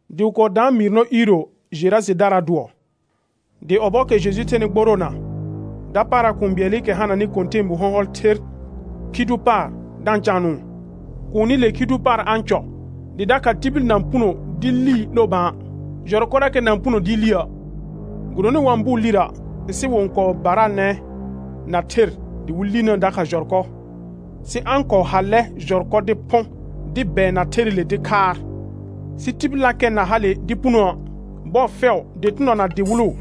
Dɩ wɩ kɔɔ daan mɩɩr nɔ iiro Jerajedaraa dʋɔ. Dɩ ɔbɔɔkɛ Jeju thenɩ gboroona, dapaara kũu bɩɛlɩkɛ hananɩ kɔ̃tɛɛbu hɔ̃hɔl ther khi dʋ paar da-n caanʋʋ. Kuunile khi dʋ paar a-n cɔ dɩ dakha tibil na-n puno dɩ lii 'lo bã, jɔrkɔrakɛ na-n puno dɩɩ liə'; gɩdonɩ wa-n bʋʋ lirə', sɩ wɩ-n kɔɔ baraanɛ na ther dɩ wɩ linəə dakha jɔrkɔ, sɩ a-n kɔɔ hallɛ jɔrkɔ dɩ phʋ̃ dɩ bɛɛna therɩle dɩ khaar, sɩ tibillakɛ na hale dɩ punooə'. Bɔɔ fɛʋ, dɩtɩnɔ na dɩwɩlʋ,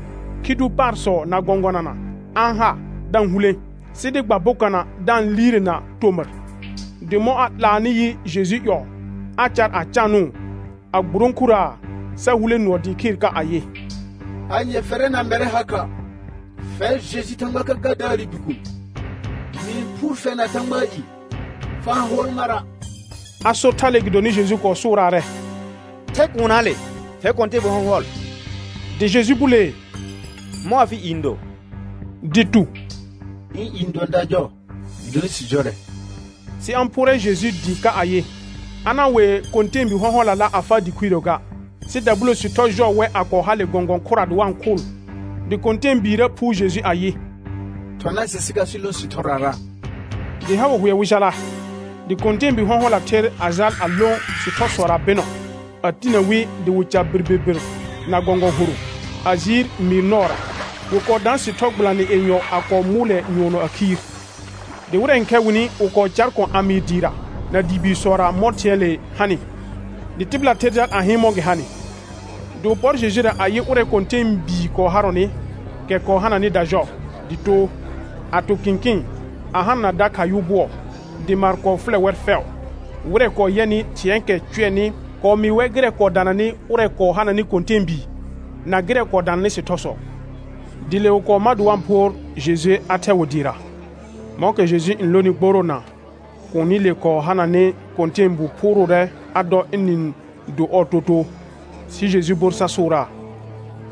khi dʋ paarsɔ na gɔ̃gʋɔna a-n ha da-n hulẽ, sɩ dɩ gba bokana da-n liirena tomɩr. Dɩ mɔ̃ a 'laanɩ yɩ Jeju ƴɔɔ, a car a caanʋʋ a gburõkuraa, sa hulẽ nʋɔ dɩɩ khɩɩr ka ayɩ: Anye fɛrɛ na mɛrɛ ha kha, fɛr Jeju Thãgba Kəkəədaarɩ Bikuun? Mɩ-n phʋʋr fɛr na Thãgbaa i, fa-n hʋɔl mara'. A sor thale gɩdonɩ Jeju kɔɔ sʋʋraarɛ: Thɛ kuunnaale, fɛr kɔ̃tɛɛbu hɔ̃hɔl. Dɩ Jeju bulee: Mɔ̃ afɩ i n do? Dɩ tu: Ɩ̃ i n dʋɔn dajɔ gɩdonɩ sɩ jɔrɛ. Sɩ a-n phʋʋrɛ Jeju dɩɩ ka ayɩ, a na-n wee kɔ̃tɛɛbi hɔ̃hɔlala a faa dɩ khuirə ga. Sɩ dabulo sɩthɔ jɔɔ wɛ a kɔɔ hale gɔ̃gɔ̃ khʋra dɩ wa-n khʋʋl. Dɩ kɔ̃tɛɛbiirə phʋʋr Jeju ayɩ: Thɔna sɩ sɩ jal sɩ lõ sɩthɔrara. Dɩ ha wɩ hʋɛ wɩ jala, dɩ kɔ̃tɛɛbi hɔ̃hɔla ther a jal a lõ sɩthɔsɔra bɩnɔ, a tinə wi dɩ wɩ ca birbirbir na gɔ̃gɔ̃ horʋ, a jiir mɩɩr nɔɔra; wɩ kɔɔ daan sɩthɔ gbɩlanɩ yenyɔ a kɔɔ mʋʋlɛ nyʋɔnɔ a khiir. Dɩ wɩrɛ n khɛ wɩnɩ, wɩ kɔɔ caar kɔ̃ a mɩɩ dɩɩra na dɩ biisɔra mɔ̃ thɩ̃ɛɛle hanɩ, dɩ tɩbɩla ther jal a hɩɩn mɔ̃ gɩ hanɩ. Dɩ wɩ pɔr Jejura a yɩ ʋrɛ kɔ̃tɛɛbii kɔɔ harɔnɩ, kɛ kɔɔ hananɩ dajɔ, dɩ too, a to kɩ̃kɩɩn a hanana dakha yʋ bʋɔ, dɩ maar kɔɔ fʋlɛ wɛr fɛʋ. Wɩrɛ kɔɔ yɛnɩ thɩ̃ɛɛkɛ cʋɛnɩ kɔɔ mɩɩ wɛr gɩrɛ kɔɔ dananɩ ʋrɛ kɔɔ hananɩ kɔ̃tɛɛbii, na gɩrɛ kɔɔ dananɩ sɩthɔsɔ. Dɩ le wɩ kɔɔ ma dɩ wa-n phʋʋr Jeju a thɛ wɩ dɩɩra. Mɔ̃kɛ Jeju n lonɩ gboroona, kuunile kɔɔ hananɩ kɔ̃tɛɛbii phʋʋrʋʋrɛ a dɔ ɩnɩ-n do ɔɔ totoo. Sɩ Jeju bor sa sʋʋraa: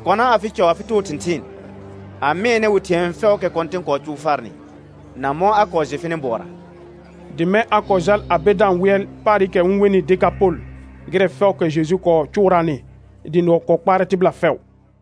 Kɔna afɩ cɔ afɩ too thɩ̃thɩɩn, a mɩɛnɛ wɩ thɩ̃ɛ fɛʋʋkɛ Kɔ̃tɩn kɔɔ cʋʋ farnɩ, na mɔ̃ a kɔɔ jɩ fɩnɩ bʋɔra. Dɩ mɛ̃ a kɔɔ jal a be da-n wɩɛl paarɩkɛ wɩ-n wenɩ Dekapol gɩrɛ fɛʋʋkɛ Jeju kɔɔ cʋʋraanɩ, dɩ nʋɔ kɔɔ kpaarɛ tɩbɩla fɛʋ.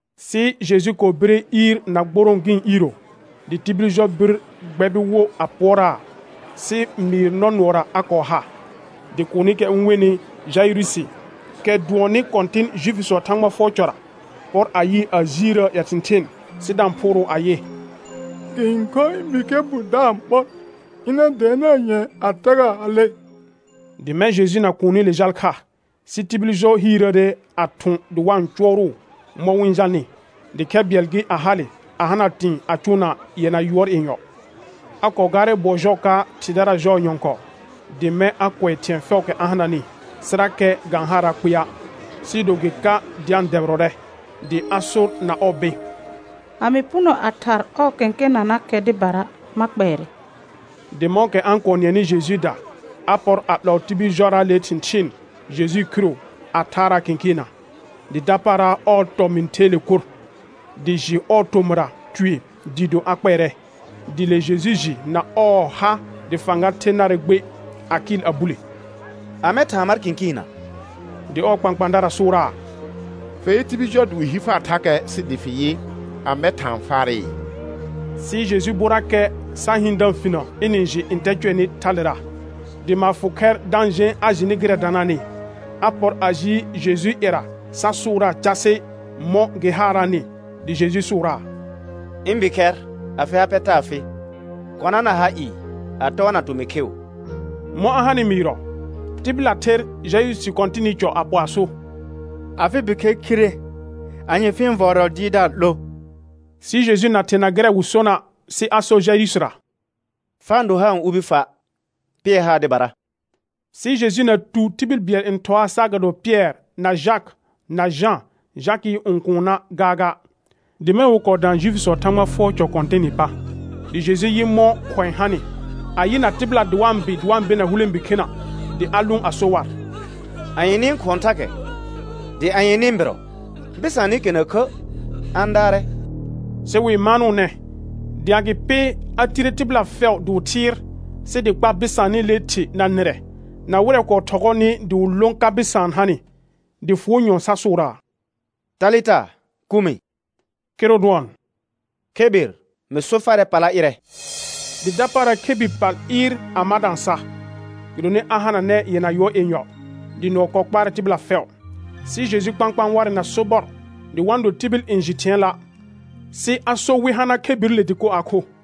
Sɩ Jeju kɔɔ bire iir na gborõo gɩ̃ iiro, dɩ tibil jɔ bir gbɛbɩ wo a pʋɔraa, sɩ mɩɩr nɔ nʋɔra a kɔɔ ha. Dɩ kuunikɛ wɩ-n wenɩ Jaɩrʋsɩ, kɛ dʋɔnnɩ kɔ̃tɩn Juifisɔɔ Thãgba fʋɔr cɔra, pɔr a yɩɩ a jiirəə ƴɛ thɩ̃thɩɩn, sɩ da-n phʋʋrʋʋ ayɩ: Gɩ-n khor ɩ̃ bikhɛr bu da-n ɓɔr; ɩna dɛɛnaa nyɛ̃ɛ a tagaa a le. Dɩ mɛ̃ Jeju na kuunile jal kha, sɩ tibil jɔ hiirəəre a thʋ̃ dɩ wa-n cʋɔrʋʋ mɔ̃ wɩ-n jalnɩ. Dɩ khɛ bɩɛl gɩ, a hale a hana tɩ̃ɩ a cʋʋna yɛna yʋɔr yenyɔ. A kɔɔ gaarɛ bʋɔ jɔɔ ka thɩdara jɔɔ nyɔ̃kɔɔ, dɩ mɛ̃ a kʋɛ thɩ̃ɛ fɛʋʋkɛ a hananɩ, sɩrakɛ ga-n haaraa kpɩa', sɩɩ do gɩ ka dɩ a-n dɛbɩrɔrɛ; dɩ a sor na ɔɔ bɩ̃: A mɩ puno a thar ɔɔ kẽkenanakɛ dɩbara, ma kpɛɛrɛ. Dɩ mɔ̃kɛ a-n kɔɔ nɩɛnɩ Jejuuda, a pɔr a 'lɔɔ tibil jɔraale thɩ̃thɩɩn Jejuu khiro a thaaraa kɩ̃kɩɩnna. Dɩ dapaara ɔɔ tɔmɩ̃ theele kur, dɩ jɩ ɔɔ tomɩra tue dɩɩ do a kpɛɛrɛ. Dɩ le Jeju jɩ na ɔɔ ha dɩ fãga the narɛ gbe, a kɩɩl a bule: Amɛ thaan mar kɩ̃kɩɩnna? Dɩ ɔɔ kpãkpãadara sʋʋraa: Fe yɩ tibil jɔ dɩ wɩ hi far thakɛ sɩ dɩ fɩ yɩ, amɛ thaan farɩ? Sɩ Jeju borrakɛ sa hɩɩn da-n finə ɩnɩ-n jɩ ntɛ cʋɛnɩ thalera. Dɩ maar fʋ khɛr da-n jẽ a jɩnɩ gɩrɛ danaanɩ, a pɔr a ji Jejuu ƴɛra sa sʋʋraa casɩ mɔ̃ gɩ haaraanɩ. Dɩ Jeju sʋʋraa: Ɩ̃ bikhɛr afɩ ha pɛ taa fɩ, kɔna na ha ɩɩ a tɔɔna tomɩ kheu. Mɔ̃ a hanɩ mɩɩrɔ, tɩbɩla ther Jaɩrʋsɩ kɔ̃tɩnɩ cɔ a pɔ a so: Afɩ bikhɛr khire, anye fɩ-n vɔɔrɔ Dɩɩrdaar 'lo? Sɩ Jeju na therna gɩrɛ wɩ sona', sɩ a sor Jaɩrʋsɩra: Fa-n do haar n ubi fa', pɩɛr haar dɩbara. Sɩ Jeju na tu tibil bɩɛl n ɩhɔaa saagado Pɩɛr na Jakɩ na Jã, Jakɩɩ õkuunna gaaga. Dɩ mɛ̃ wɩ kɔɔ dã Juifisɔɔ Thãgba fʋɔr cɔ kɔ̃tɩnɩ pa, dɩ Jeju yɩ mɔ̃ khʋ̃ɛ hanɩ, a yɩna tɩbɩla dɩ wa-n bɩ dɩ wa-n bena hulẽbi khena; dɩ a lʋʋn sa so war: Anye nɩ-n khʋɔn thakɛ, dɩ anye nɩ-n bɩrɔ, bɩsaanɩkɛ na khə', a-n daarɛ. Sɩ wɩ-n maanʋʋnɛ, dɩ agɩpɩ a tire tɩbɩla fɛʋ dɩ wɩ thɩɩr, sɩ dɩ kpa bɩsaanɩlee thɩ na nɩrɛ, na wɩrɛ kɔɔ thɔgɔɔnɩ dɩ wɩ lõ ka bɩsaan hanɩ, dɩ fʋʋ nyɔ̃ɔ sa sʋʋraa: Talɩta kumɩ; kɩrʋ dʋɔn: Khebir, mɩ so farɛ pala ɩrɛ. Dɩ dapaara khebir pal ɩɩr a ma da-n sa, gɩdonɩ a hananɛ yɛna yʋɔr yenyɔ; dɩ nʋɔ kɔɔ kpaarɛ tɩbɩla fɛʋ. Sɩ Jeju kpãkpãa warɛ na sobɔr dɩ wa-n do tibil n jɩ thɩ̃ɛɛla', sɩ a sor wɩ hana khebirile dɩkor a kho.